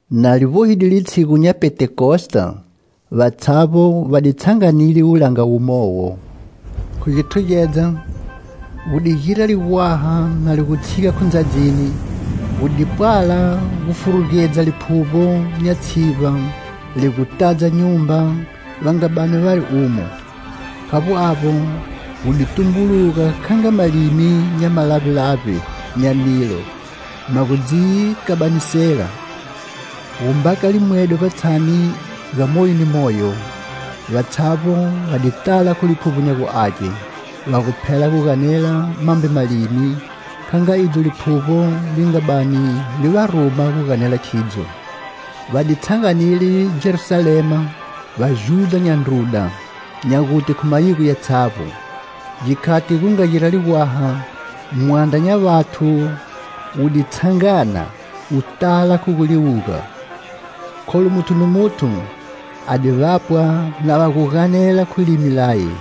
Na li vbohide litshigu nya Pentekosta, vatshavbo va di tshanganile wulanga wumowo. Khu githugedza, gu di gira ligwaha na li gu tshiga khu ndzadzini, gu di pwala gufurugedza liphuvbo nya tshivba li gu tadza nyumba va nga bani vari umo. Khavbo avbo, gu di tumbuluga kha nga malimi nya malavbelavbe nya nilo ma gu dzi kabanisela, gu mbaka limwedo vbatshani ga moyo ni moyo. Vatshavbo va di tala khu Liphuvbo nya gu Age, va gu phela gu ganela mambe malimi, kha nga idzo Liphuvbo li nga bani li va ruma gu ganela khidzo. Va di tshanganile Jerusalema vaJudha nya ndruda, nya gute khu mayigoni yatshavbo. Gikhati gu nga gira ligwaha, mwandra nya vathu wu di tshangana, wu tala khu gu liwuga, kholu muthu ni muthu a di vapwa na va gu ganela khu limi laye.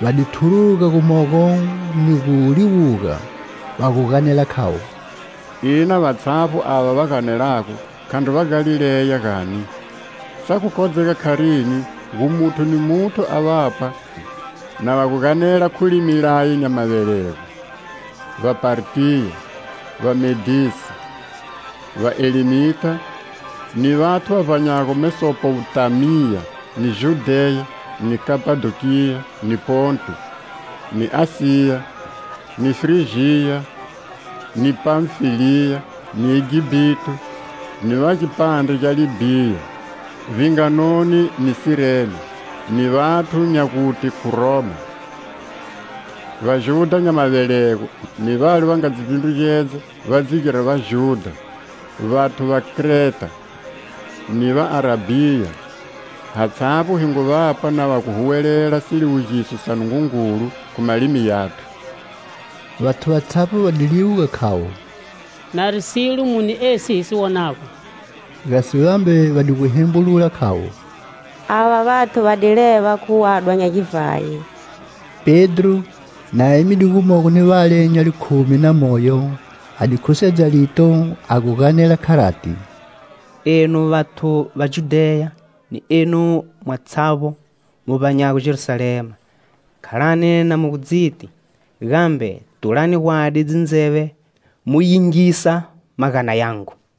Va di thuruga gumogo ni gu liwuga, va gu ganela khavo: "Ina vatshavbo ava va ganelago khandri Vagalileya, gani? Sa gu kodzega kharini gu muthu ni muthu a vapwa na va gu ganela khu limi laye nya mavelego? Vapartiya, Vamedesi, Vaelemita ni vathu va vbanyago Mesopotamiya ni Judheya ni Kapadokiya ni Ponto, ni Asiya, ni Frijiya ni Panfiliya, ni Egipito ni va gipandre gya Libhia, vbinganoni ni Sirene, ni vathu nya gute khu Roma; vaJudha nya mavelego ni vale va nga dzi vbindrugedza va dzi gira vaJudha, vathu va Kreta ni va Arabhiya, hatshavbo hi ngu vapwa na va gu huwelela siliwugiso sa Nungungulu khu malimi yathu." Vathu vatshavbo va di liwuga khavo: "Nari silo muni esi hi si wonago?" Gasi vambe va di gu hembulula khavo: "Ava vathu va di leva khu wadwa nya givhayi." Pedro, na emide gumogo ni vale nya likhumi na moyo, a di khusedza lito a gu ganela kharati: "Enu vathu va Judheya ni enu mwatshavbo mu vbanyago Jerusalema, khalani na mu gu dziti, gambe tulani gwadi dzindzeve mu yingisa magana yangu.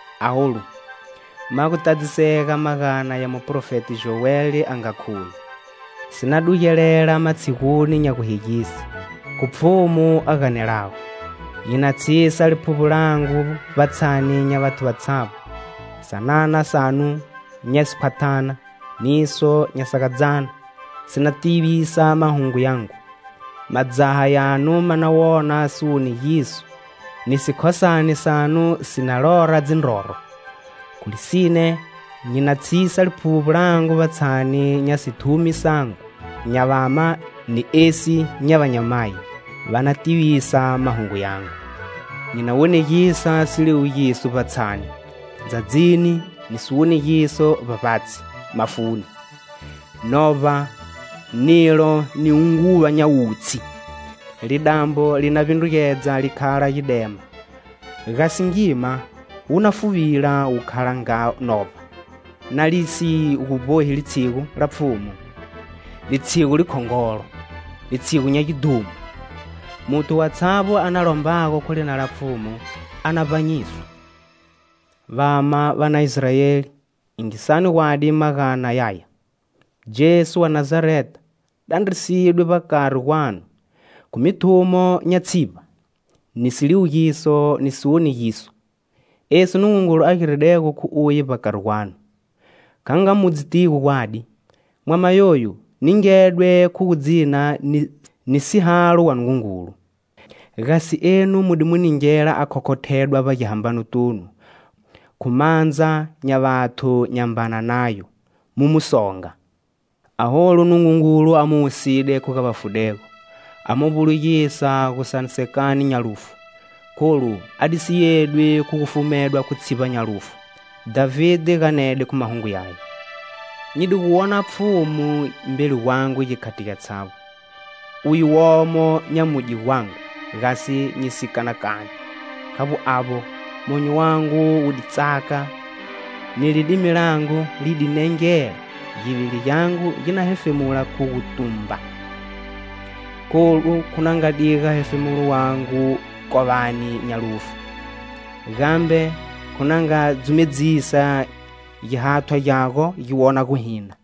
Aholu, ma gu tadzisega magana ya muprofeti Joeli a nga khuye: 'Si na dugelela matshiguni nya guhegise,khu Pfhumu a ganelago,nyi na tshisa Liphuvbo langu vbatshani nya vathu vatshavbo,sanana sanu nya sikhwathana niso nya sagadzyana si na tivisa mahungu yangu madzaha yanu ma na wona siwonegiso ni sikhosane sanu si na lora dzindroro. Khu lisine nyi na tshisa Liphuvbo langu vbatshani nya sithumi sangu nya vama ni esi nya vanyamayi,va na tivisa mahungu yangu. Nyi na wonegisa siliwugiso vbatshani, ndzadzini,ni siwonegiso vbavbatshi, mafuni; Novba, nilo ni hunguva nya wutshi. Lidambo li na vbindrugedza li khala gidema gasi ngima wu na fuvila wu khala nga novba.Na li si gu vbohi litshigu la Pfhumu:Litshigu likhongolo, litshigu nya gidhumo. Muthu watshavbo a na lombago khu lina la Pfhumu a na vbanyiswa.' "Vama va na Israeli, yingisani gwadi magana yaya. Jesu wa Nazareta dandrisidwe vbakari gwanu khu mithumo nya tshivba, ni siliwugiso, ni siwonegiso esi Nungungulu a giridego khu uye vbakari gwanu, kha nga mu dzitigo gwadi. Mwama yoyu ningedwe khu gu dzina ni sihalo wa Nungungulu, gasi enu mu di mu ningela a khokhothedwa vbagihambanotunu khu mandza nya vathu nyambana nayo, mu mu songa. Aholu Nungungulu a mu wusile khu ga vafudego, a mu vbulugisa gusanisekani nya lufu, kholu a di si yedwi khu gu fumedwa khu tshivba nya lufu. Dhavide ganede khu mahungu yaye: 'Nyi di gu wona Pfhumu mbeli gwangu gikhati gyatshavbo Uye womo nyamudye gwangu gasi nyi si kanakani. Khavbo avbo, monyo wangu wu di tsaka ni lidimi langu li di nengela givili gyangu gi na hefemula khu gutumba Kholu khu na nga diga hefemulo wangu kovani nya lufu gambe khu na nga dzumedzisa gihathwa gyago gi wona guhina.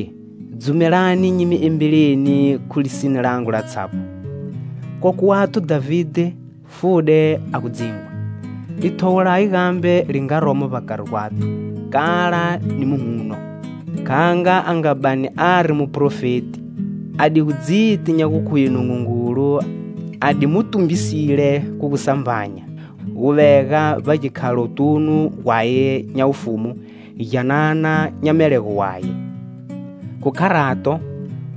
Vandruye, dzumelani nyi mi embeleni khu lisine langu latshavbo: Kokwe wathu Dhavide fude a gu dzingwa. Lithowo laye gambe li nga romo vbakari gwathu kala ni muhuno. Kha nga a nga bani ari muprofeti a di gu dziti nya gu khuye Nungungulu a di Mu tumbisile khu gusambanya, gu vega vbagikhalotunu gwaye nya wufumu gyanana nya melego waye. Khu kharato,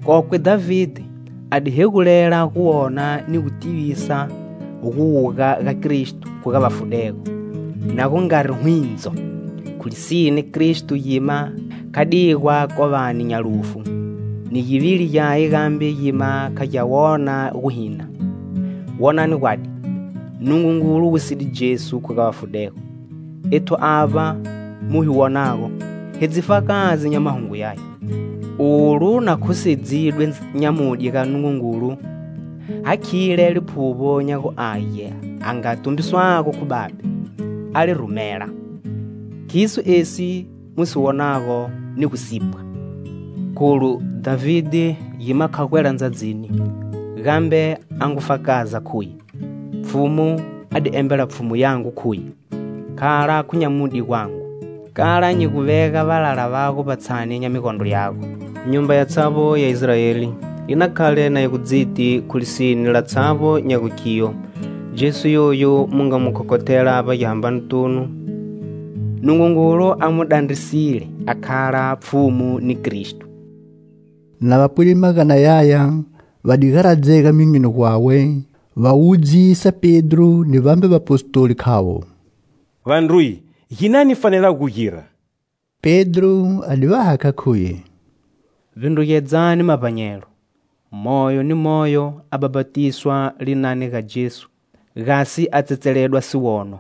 kokwe Dhavide a di hegulela gu wona ni gu tivisa guwuga ga Kristo khu ga vafudego na gu ngari hwindzo. Khu lisine Kristo gima kha digwa kovani nya lufu, ni givili gyaye gambe gima kha gya wona guhina. Wonani gwadi, Nungungulu wusile Jesu khu ga vafudego, ethu avba mu hi wonago, hi dzifakazi nya mahungu yaya. Olu na khusedzidwe nyamudye ga Nungungulu hakhile Liphuvbo nya gu Age a nga tumbiswago khu Babe, a li rumela. Khiso esi mu si wonago ni gu sipwa. Kholu Dhavide gima kha gwela ndzadzini gambe a ngu fakaza khuye: 'Pfhumu a di embela Pfhumu yangu khuye:Khala khu nyamudye gwangu kala nyi gu vega valala vago vbavbatshi nya migondro yago.' Nyumba yatshavbo ya Israeli yi na khale na yi gu dziti khu lisine latshavbo nya gu khiyo Jesu yoyu mu nga mu khokhothela vbagihambanotunu, Nungungulu a mu dandrisile a khala Pfhumu ni Kristo." Na va pwide magana yaya va di garadzega myonyoni gwawe, va wudzisa Pedro ni vambe vapostoli khavo: "Vandruye, ginani hi fanelago gugira?" Pedro a di va hakha khuye: "Vbindrugedzami mavbanyelo, moyo ni moyo a bhapatiswa Linani ga Jesu gasi a tsetseledwa siwono.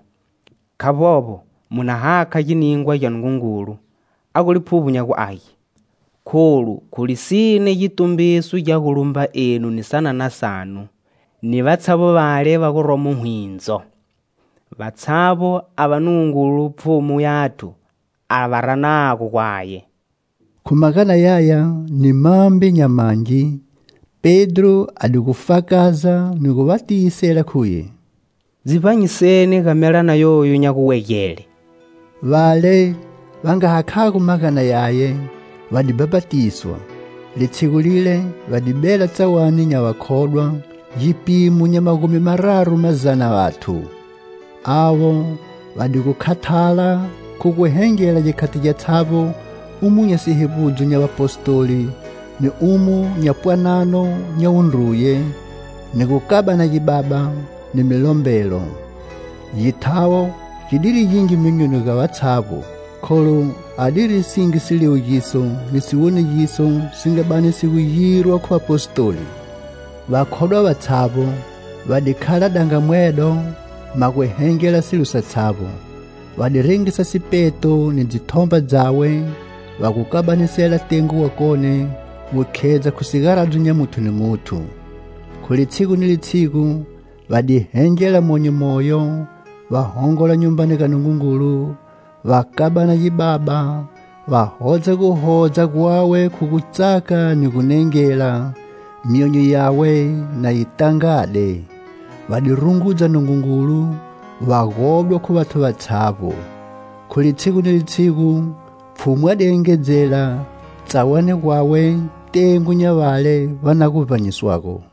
Khavbovbo mu na hakha giningwa gya Nungungulu a gu Liphuvbo nya gu Age. Kholu khu lisine gitumbiso gya gu lumba enu ni sanana sanu ni vatshavbo vale va guromo hwindzo; vatshavbo ava Nungungulu Pfhumu yathu a va ranago gwaye." Khu magana yaya ni mambe nya mangi, Pedro a di gu fakaza ni gu va tiyisele khuye: "Dzi vbanyiseni ga melana yoyu nya guwegele." Vale va nga hakhago magana yaye va di bhapatiswa. Litshigu lile va di bela tsawani nya vakhodwa gipimo nya magumi mararu mazana vathu. Avo va di gu khathala khu gu hengela gikhati gyatshavbo umo nya sihevbudzo nya Vapostoli ni umo nya pwanano nya wundruye, ni gukabana gibaba, ni milombelo. Githawo gi diri gingi myonyoni ga vatshavbo, kholu adiri singi siliwugiso ni siwonegiso si nga bani si gu girwa khu Vapostoli. Vakhodwa vatshavbo, va di khala dangamwedo ma gu hengela silo satshavbo; va di rengisa sipeto ni dzithomba dzawe va gu kabanisela tengo wakone gu khedza khu sigaradzo nya muthu ni muthu; Khu litshigu ni litshigu va di hengela monyo moyo, va hongola Nyumbani ga Nungungulu, va kabana gibaba, va hodza guhodza gwawe khu gutsaka ni gu nengela, myonyo yawe na yi tangade. Va di rungudza Nungungulu, va godwa khu vathu vatshavbo. Khu litshigu ni litshigu, Pfhumu a di engedzela tsawani gwawe tengo nya vale va na gu vbanyiswago.